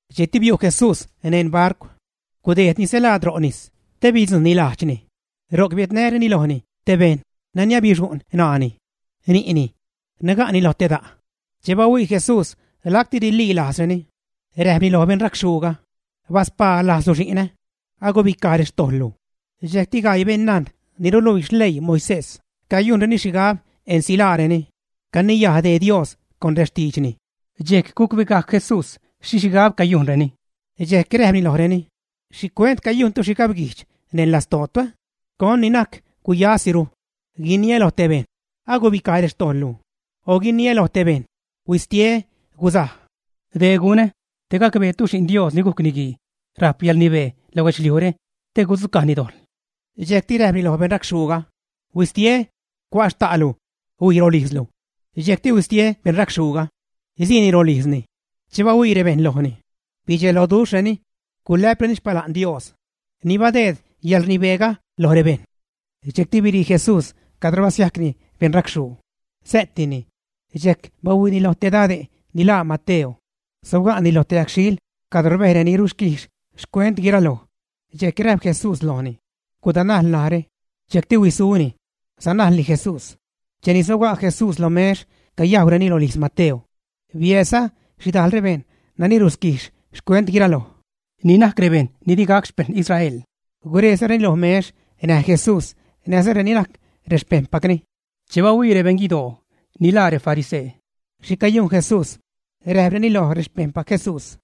Dxejcti biu' Jesús neṉ barcw. Gudejdni stelaad ro' nis te bidzujṉni lajdxni. Ro'c biädnäreni lojni te bejṉ nani abixu'ṉ ṉaani, ni'ni. Naga'ni lo te da'. Che bahuii Jesús lacti rililajzreni, räjpni loj beṉracxhuuga: ―¡Baspaa lajzlu xi'nä! Agubicaj rextojḻlu. Dxejcti gaii beṉnajn ni ruluii xleii Moisés cayujnreni xhigab ensilaareni, caniyaj dee Dios con rextiidxni. Dxejc gucbegajc Jesús xhi xhigab cayujnreni, dxejc räjpni lojreni: ―¿Xhicuent cayujntu xhigabguijdx neṉ lastootu? ¿Con ni najc guyasiru? Guiniä lo te bejṉ: “Agubicaj rextojḻlu”, o guiniä lo te bejṉ: “Huistie, guzaj.” Dec gunä te gacbeetu Xi'n Dios ni gujc Niguii rajp yäḻrnibee lo guedxliujre te gudzucajni dojḻ. Dxejcti räjpni loj beṉracxhuuga: ―Huistie, cua' xta'lu, huij rolijzlu. Dxejcti huistie beṉracxhuuga, siini rolijzni. Che bahuii rebejṉ lojni, bidxeloduxhreni, gulä'preni xpala'n Dios, ni badeed yäḻrnibeega loj rebejṉ. Dxejcti birii Jesús cadro basiajcni beṉracxhuu, sä'tini. Dxejc bahuiini loj te dade' ni laa Mateo. Sobga'ni loj te yagxhiil cadro rbej reni ruquijx xcuent guiraloj. Dxejc räjp Jesús lojni: ―Gudanajl narä. Dxejcti huisuni, sanajlni Jesús. Cheni sobga' Jesús lo mex cayajwreni rolijz Mateo, biäädza xhidajl rebejṉ nani ruquijx xcuent guiraloj, ni najc rebejṉ ni di gac xpeṉ Israel, gurejzareni lo mex näj Jesús näjza reni najc rexpejṉpacni. Che bahuii rebeṉ guidoo, ni laa refarisee, xhi cayujn Jesús, räjpreni loj rexpejṉpac Jesús: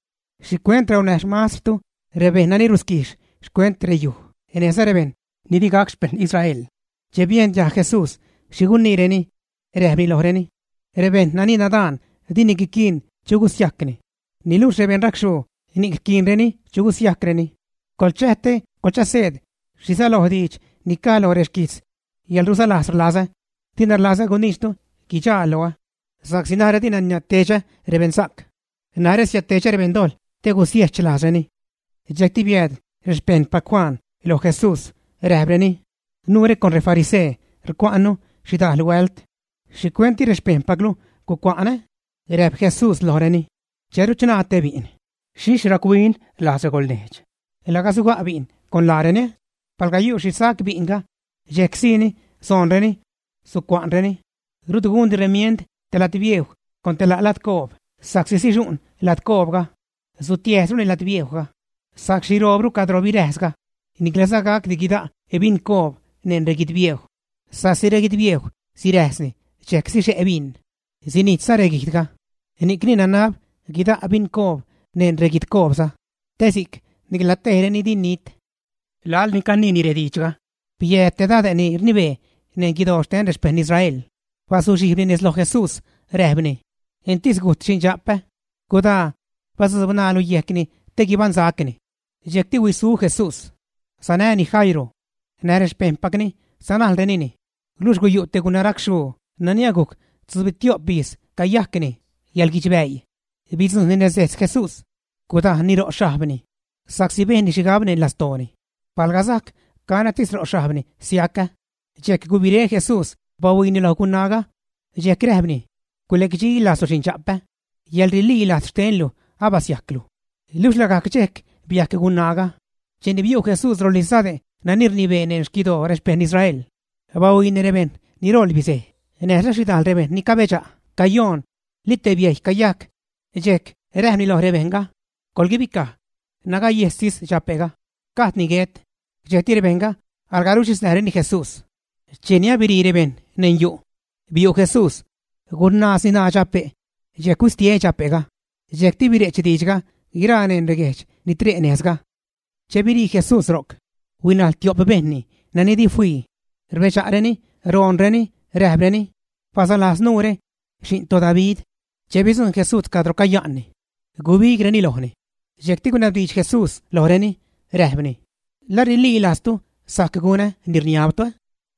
―¿Xhicuent raunäj xmastrtu rebejṉ nani ruquijx xcuent reyuj näjza rebejṉ ni di gac xpeṉ Israel? Che biejn diajg Jesús xhi guniireni, räjpni lojreni: ―Rebejṉ nani nadaan dini guiquiin chu gusiajcni, niluxh rebejṉ racxhuu ni'c rquiinreni chu gusiajcreni. Coḻchäj te coḻchaseed xhi säloj diidxre ni caj loj reguijtz: “Yäḻrulaslajz rlazä, dina rlazä guniidxtu guidxaa loä.” Sa'csi narä dina niädtedxä rebeṉsa'c, narä siädtedxä rebeṉdojḻ te gusiechlajzreni. Dxejcti biääd rexpejṉpac Juan loj Jesús räjpreni: ―Nuure con refarisee rcua'nnu xhidal huält, ¿xhicuent di rexpejṉpaclu gucua'n, ä? Räjp Jesús lojreni: ―Che ruchṉaa te bi'n, ¿xhixh rac-huin lajz regolnejdx laga suga' bi'n con laareni? Palga yu' xhi sac bi'nga, dxejc sii soonreni, sucua'nreni. ’Rut gundi remiend te ladbiejw con te la' ladcoob sa'csi sixu'n ladcoobga, sutiäjsruni ladbiejwga, sajc xhiroobru cadro biräjsga. Niclaza gac guida' bincoob neṉ reguidbiejw, sa'csi reguidbiejw siräjsni dxejc sixe' bin, sinijtza reguijdga. Ni'cni nanab guida' bincoob neṉ reguidcoobza, te si'c nicla tejreni di nit. Laḻ ni caniini rediidxga, biääd te dade' ni rnibee neṉ guidoo xten rexpejṉ Israel. Bazuxhijbni nez loj Jesús räjpni: ―Entis gujt xindxa'pä. Gudaa, badzuub ṉaalu yejcni te guibaṉsacni. Dxejcti huisu Jesús, sanäni Jairo. Näj rexpejṉpacni sanajlrenini. Luxh guyu' te gunaracxhuu nani agujc tzubitio'p ijz cayajcni yäḻguidxbäii. Bidzujṉni nez dejtz Jesús, gudajnni ro' xhajbni, sa'csi bejnni xhigab neṉ lastooni: “Palga sajc canätis ro' xhajbni, siacä.” Dxejc gubiré Jesús bahuiini loj gunaaga, dxejc räjpni: ―Gulecdxilajzlu xindxa'pä. Yäḻrililajz xtenlu abasiajclu. Luxh lagajc dxejc biajc gunaaga. Cheni biu' Jesús rolijz dade' nani rnibee neṉ xquidoo rexpeṉ Israel, bahuiini rebejṉ ni ṟoḻ bizej näjza xhidajl rebejṉ ni cabedxa' cayoon, li te biejy cayajc, dxejc räjpni loj rebejṉga: ―Coḻguibicaj. Nagayejstis dxa'pga, gajdni guet. Dxejc rebejṉga alga ruxhiznäjreni Jesús. Cheni abirii rebejṉ neṉ yu', biu' Jesús, gunaazni ṉaa dxape', dxejc huistie dxape'ga. Dxejcti bire'ch diidxga guiraa neṉ reguejdx ni tre' nejzga. Che birii Jesús ro'c, huinajl tio'p bejṉni nani di fii. Rbedxa'reni roonreni räjpreni: ―Balaslajz nuure, Xi'n toDavid. Che bidzujṉ Jesús cadro caya'nni, gubigreni lojni. Dxejcti gunabdiidx Jesús lojreni, räjpni: ―¿La rililajztu sajc gunä ni rniabtu?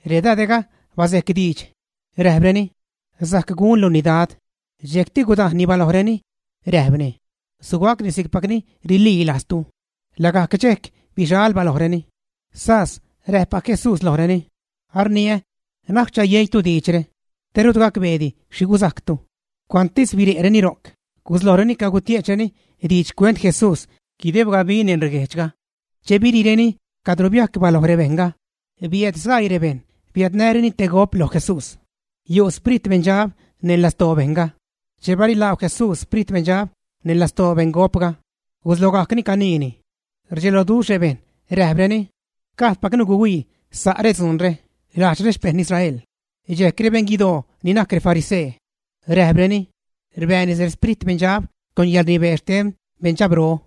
Redade'ga basejc diidx, räjpreni: ―Sajc gunluni, Dad. Dxejcti gudajnni balojreni, räjpni: ―Sugacni si'cpacni rililajztu. Lagajc dxejc bixal balojreni. Sas räjppac Jesús lojreni: ―Arniä, na'c chayeitu diidxre, te rut gacbeedi xhi guzajctu. Cuantsi biriireni ro'c guslojreni cagutie'chreni diidx xcuent Jesús guideb gabi neṉ reguejdxga. Che biriireni cadro biajc baloj rebejṉga, biääd sgaii bejṉ biädnäreni te gop loj Jesús. Yu' xprit beṉdxab neṉ lastoo bejṉga. Che barilaagw Jesús xprit beṉdxab neṉ lastoo beṉgopga, guslogajcni caniini. Rdxeloduxh rebejṉ räjpreni: ―Gajdpacnu guihuii sa' redzuunre lajdx rexpejṉ Israel. Dxejc rebeṉ guidoo ni najc refarisee, räjpreni: ―Rbääni rexprit beṉdxab con yäḻrnibee xten beṉdxabro.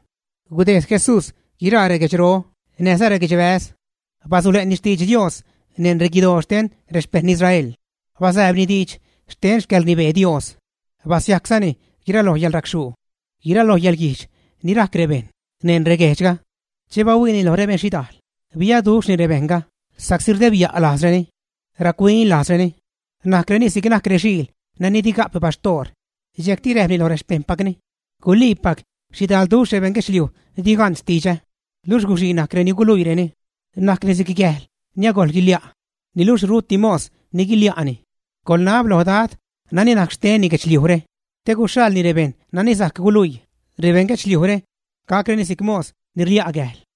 Gudejd Jesús guiraa reguedxro näjza reguedxbäz, basule'ni xtidx Dios neṉ reguidoo xten rexpejṉ Israel. Basääbni diidx xten xcäḻrnibee Dios. Basiajczani guiraloj yäḻracxhuu, guiraloj yäḻguijdx ni rajc bejṉ neṉ reguejdxga. Che bahuiini loj rebeṉ xhidajl biaduxhni rebejṉga sa'csi rdebya' lajzreni, rac-huin lajzreni, najcreni si'c najc rexiil nani di ga'p baxtoor. Dxejcti räjpni loj rexpejṉpacni: ―Guliipac xhidalduxh beṉ guedxliuj di gan xtidxä, luxh guxii najc reni guluiireni; najcni si'c gäjl ni agojl guilia', niluxh ruti mos ni guilia'ni. Coḻnab lo Dad nani najc xtenni guedxliujre te guxhaḻni rebejṉ ni sajc guluii rebeṉ guedxliujre, gacreni si'c mos ni rlia' gäjl.